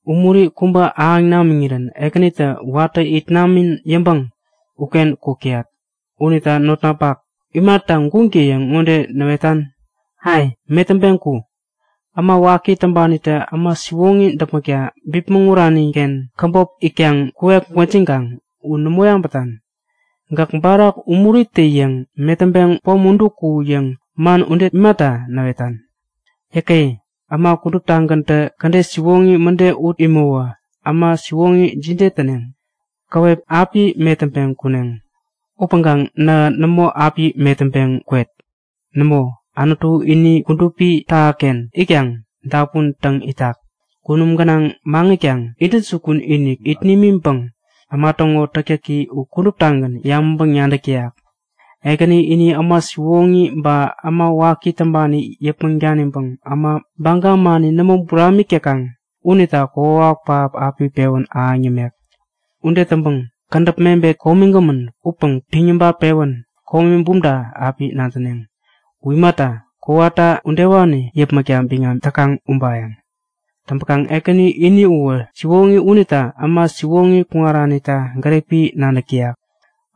Umuri kubä ahäŋ namiŋirän Ekänitä watä it namän yäŋpäŋ uken kuk täyat. Unita notnapak, imata guŋtä-yäŋ ŋode näwetan? Ai! Metäŋpeŋ ku! Äma waki täŋpanitä äma siwoŋi däpmäkta bipmäŋ uraniken käbop itkaŋ kuwek gwäjikaŋ u nämo yabätan? Gäk barak umuritä-yäŋ metäŋpeŋ pom udu ku! yäŋ man ude imata näwetan? Yäke! Äma kuduptagäntä kädet siwoŋi mäde ut imäwä äma siwoŋi jide täneŋ? Käwep api metäŋpeŋ kuneŋ. Upäŋkaŋ nähä nämo api metäŋpeŋ kwet! Nämo, Anutu ini kudupi tähaken itkaŋ dapun täŋ itak. Kunum gänaŋ maŋitkaŋ intäjukun-inik it nimiŋpäŋ äma täŋo täktäki u kuduptagän yabäŋpäŋ-nadäk täyak. Ekäni ini äma siwoŋi ba äma waki täŋpani yäpmäŋ daniŋpäŋ äma baga mani nämo buramik täkaŋ unita kokwawak pähap api pewän ahäŋ yämek. Ude täŋpäŋ kädäp mebet komigämän upäŋ piŋ yabat-pewän komi bumta api nadäneŋ. U imata, kowata udewani yäpmäkta biŋam täkaŋ ubayäŋ. Täŋpäkaŋ Ekäni ini uwä siwoŋi unita äma siwoŋi kuŋaranita gäripi nadäk täyak.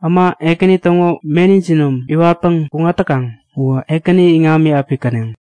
Äma Ekäni täŋo meni jinom iwatpäŋ kuŋat täkaŋ uwä Ekäni iŋami api käneŋ.